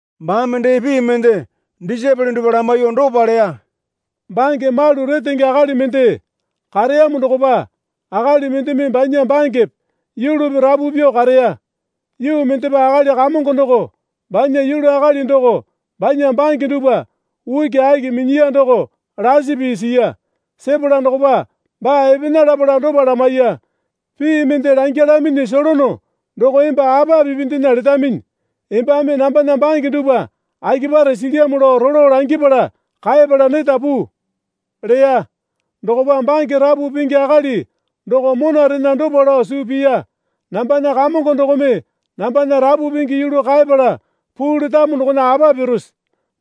Baame dee pii mende disaepole dupwa lamaiyuo dopa leya. Bange malu retenge akali mende kareyamo dokopa akali mendeme banya bangepe yulupi rapu pyuo kareya. Yuu mendepa akali kamongo doko banya yulu akali doko banya bange dupwa ukiaki minyiya doko lasi pii siya. Sepala dokopa baa epena lapala dopa lamaiya. Pii mende langyalaminyi solono doko emba apa pipindena letaminyi. Embame nambana bange dupwa akipare silyamo lao rolo langipala kaepala neta puu leya. Dokopa bange rapu pingi akali doko monarena dopa lao suu piya. Nambana kamongo dokome nambana rapu pingi yulu kaepala puu letamo dokona apa pirose?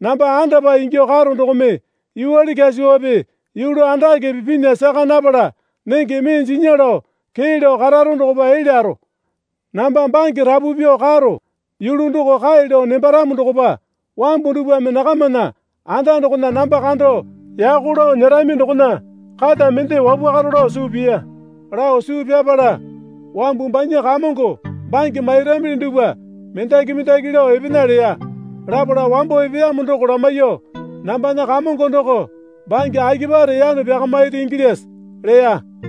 Namba andapae ingyuo karo dokome yuwale kyasuwape yulu andakepe pinya saka napala nenge mee jinya lao kee lao kararo dokopa elyaro. Namba bange rapu pyuo karo yulu doko kae lao nembaramo dokopa wambu dupwame nakamana anda dokona namba kando yako lao nyerami dokona kata mende wapwakaro lao suu piya. Lao suu pyapala wambu banya kamongo bange mairamili dupwa mendaki mendaki lao epena leya. Lapala wambo epeyamo doko lamaiyuo, Nambana kamongo doko bange akipare yano pyakamairi ingilyase? leya.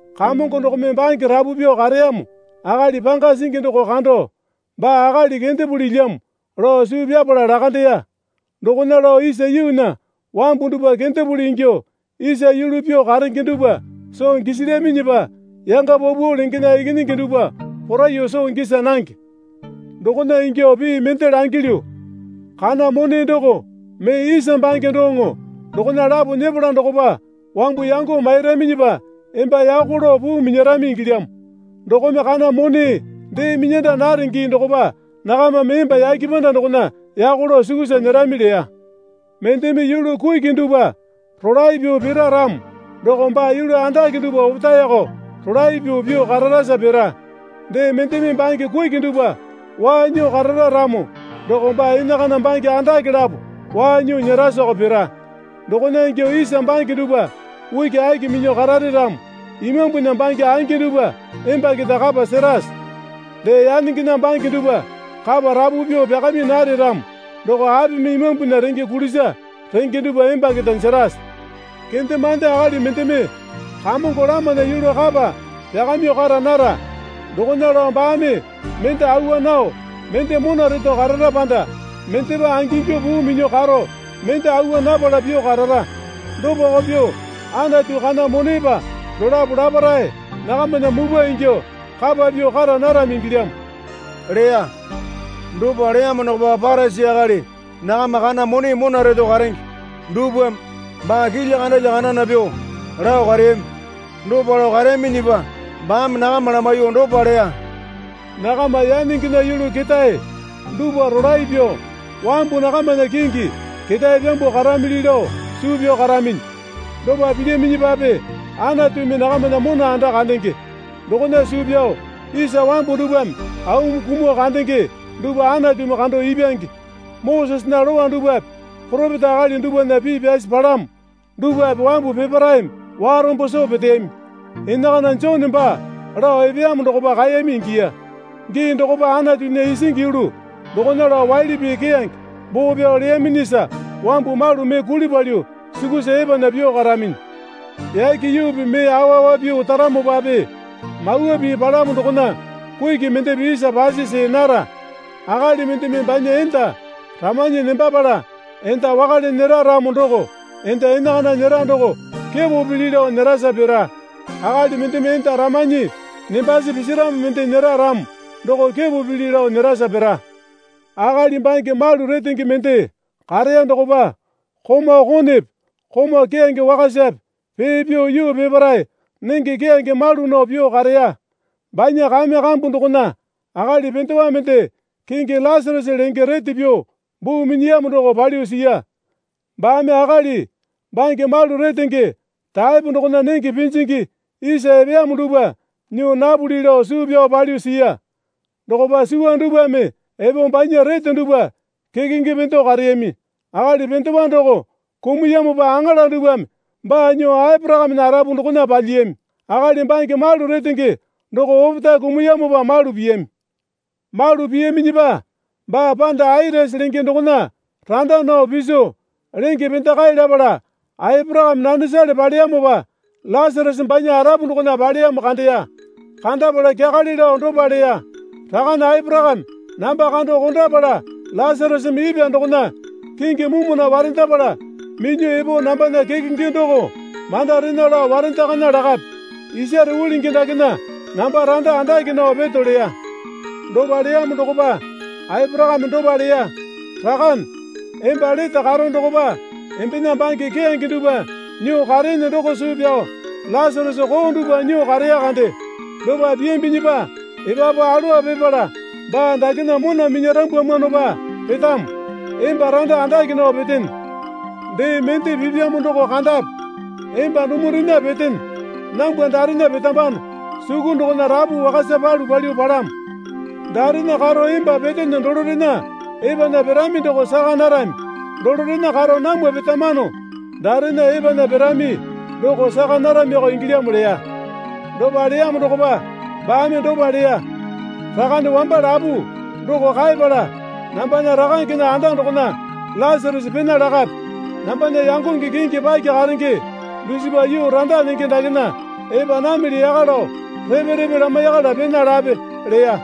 Kamongo dokome bange rapu pyuo kareyamo akali panga singi doko kando, Baa akali kendepulilyamo, lao suu pyapala lakandeya. Dokona lao isa yuunya wambu dupwa kendepuli ingyuo isa yulu pyuo karenge dupwa soo gisilyaminyipa yanga paupau lengena ikinyingi dupwa poraiyuo soo gisa nange. Dokona ingyuo pii mende langilyu. Kana mone doko mee isa bange doŋo dokona lapo nyepala dokopa wambu yango mairaminyipa emba yako lao puu minyarami ingilyamo. Dokome kana mone dee minyanda nare gii dokopa nakamame emba yake panda dokona yako lao sukusa nyerami leya. Mendeme yulu kuki dupwa rolae pyuo pira ramo doko baa yulu andake dupwa opetaeko rolae pyuo pyuo kararasa pira. Dee mendeme bange kuki dupwa waa nyuo karara ramo doko baa enakana bange andake lapo waa nyuo nyerasa pira. Dokona ingyuo isa bange dupwa ukiaki minyuo karare ramo imambunya bange angi dupwa emba keta kapa serase? Dee yanengena bange dupwa kapa rapu pyuo pyakami nare ramo doko apimi imambunya renge kulisa renge dupwa emba keta jerase? Kendemande akali mendeme kamongo lamana yulu kapa pyakamyuo kara nara. Dokona lao baame mende awa nao, mende mona reto karara panda mendepa angingyuo puu minyuo karo, mende awa napala pyuo karara. Dopako pyuo Anatu kana monepa dolapo laparae nakamana mupwa ingyuo kapa pyuo kara narami ingilyamo leya. Dopa leyamo dokopa Parisi akali nakama kana mone mona reto karenge dupwame baa kilya kandalya kandana pyuo lao kareyami. Dopa lao kareyaminyipa baame nakama lamaiyuo dopa leya. Nakama yanengena yulu ketae dupwa rolae pyuo wambu nakamana kingi ketae pyambuo karamili lao suu pyao karaminyi. Dopa pilyaminyipape Anatumi nakamana mona anda kandenge. Dokona suu pyao isa wambu dupwame aumi kumuo kandenge dupwa Anatumi kando ipyange. Mosesena Lowa dupwape poropeta akali dupwana pii pyasi palamo dupwape wambu peparaeme warombo soo peteyami. Enakana Jone baa lao epeyamo dokopa kaeyami ingiya. Gii dokopa Anatunya isingi yulu dokona lao waili pii keyange boo pyao leyaminyisa wambu malu mee kuli palyuo sukusa epana pyuo karaminyi. Yake yuupi mee awa awa pyuo otaramopape Mawa Pii palamo dokona kuki mendepe isa pasi see nara. Akali mendeme banya enda ramanyi nembapala enda wakale nyera ramo doko enda enakana nyera doko kepo pili lao nyerasa pira. Akali mendeme enda ramanyi nembasi pisiramo mende nyera ramo doko kepo pili lao nyerasa pira. Akali bange malu retenge mende kareya dokopa komau konepe komau keyange wakasape pee pyuo yuu peparae nenge keyange malu nao pyuo kareya. Banya kame kambu dokona akali pendewa mende kingi Lasarasa lenge rete pyuo buu minyiyamo doko palyuo siya. Baame akali bange malu retenge taepo dokona nenge pinjingi isa epeyamo dupwa nyuo napuli lao suu pyao palyuo siya. Dokopa suwa dupwame epo banya rete dupwa kekenge pendo kareyami. Akali pendewa doko kumuyamopa aŋala dupwame baa nyuo Aporakamena arapu dokona palyiyami. Akali bange malu retenge doko opetae kumuyamopa malu piyami. Malu piyaminyipa baa panda Atisi lenge dokona randa nao piso, lenge pendakae lapala Aporakame nanesale paleyamopa Lasarasa banya arapu dokona paleyamo kandeya. Kandapala kyakale lao dopa leya. Rakane Aporakame namba kando kondapala Lasarasame ipwa dokona kingi mumuna warendapala minyuo epo nambana kekenge doko mandarena lao warendakana lakape. Isare ulingi dakena namba randa andake nao peto leya. Dopa leyamo dokopa Aporakame dopa leya. Rakane, emba lete karo dokopa embena bange keyange dupwa nyuo kareene doko suu pyao Lasarasa koo dupwa nyuo kareya kande. Dopa piyambinyipa epapu alowa pipala baa dakena mona minyarambwamwanopa petamo, emba randa andake nao petene. Dee mende pipyamo doko kandape. Emba dumurena petene nambwa darena petambano suku dokona rapu wakasa palu palyuo palamo. Daerena karo emba petene dolorena epanya pirami doko saka narami. Dolorena karo namwa petamano daerena epanya pirami doko saka naramiko ingilyamo leya. Dopa leyamo dokopa baame dopa leya. Rakane wamba lapu doko kaepala, nambana rakangena anda dokona Lasarasa pena lakape. Nambana yangonge kingi paki karenge dusipa yuu randa nenge dakena epa namili yaka lao repe repe lamaiyakala pena lape, leya.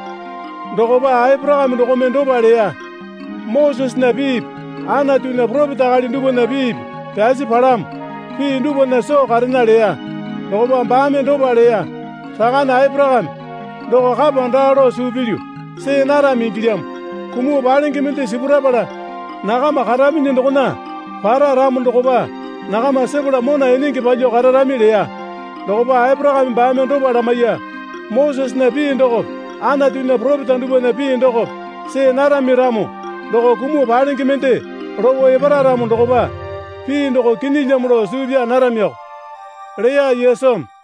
Dokopa Aporakame dokome dopa leya. Mosesena piipi Anatunya poropeta akali dupwana piipi pyasi palamo. Pii dupwana soo karena leya. Dokopa baame dopa leya. Rakane Aporakame, doko kapa daa lao suu pilyu see narami ingilyamo. Kumuo palenge mende sipurapala nakama karaminyi dokona para ramo dokopa nakama sepala mona enenge palyuo kararami leya. Dokopa Aporakame baame dopa lamaiya. Mosesena pii dokope Anatunya poropeta dupwana pii dokope see narami ramo doko kumuo palenge mende lopo epara ramo dokopa pii doko kinyilyamo lao suu pyaa naramiko, leya Yesumi.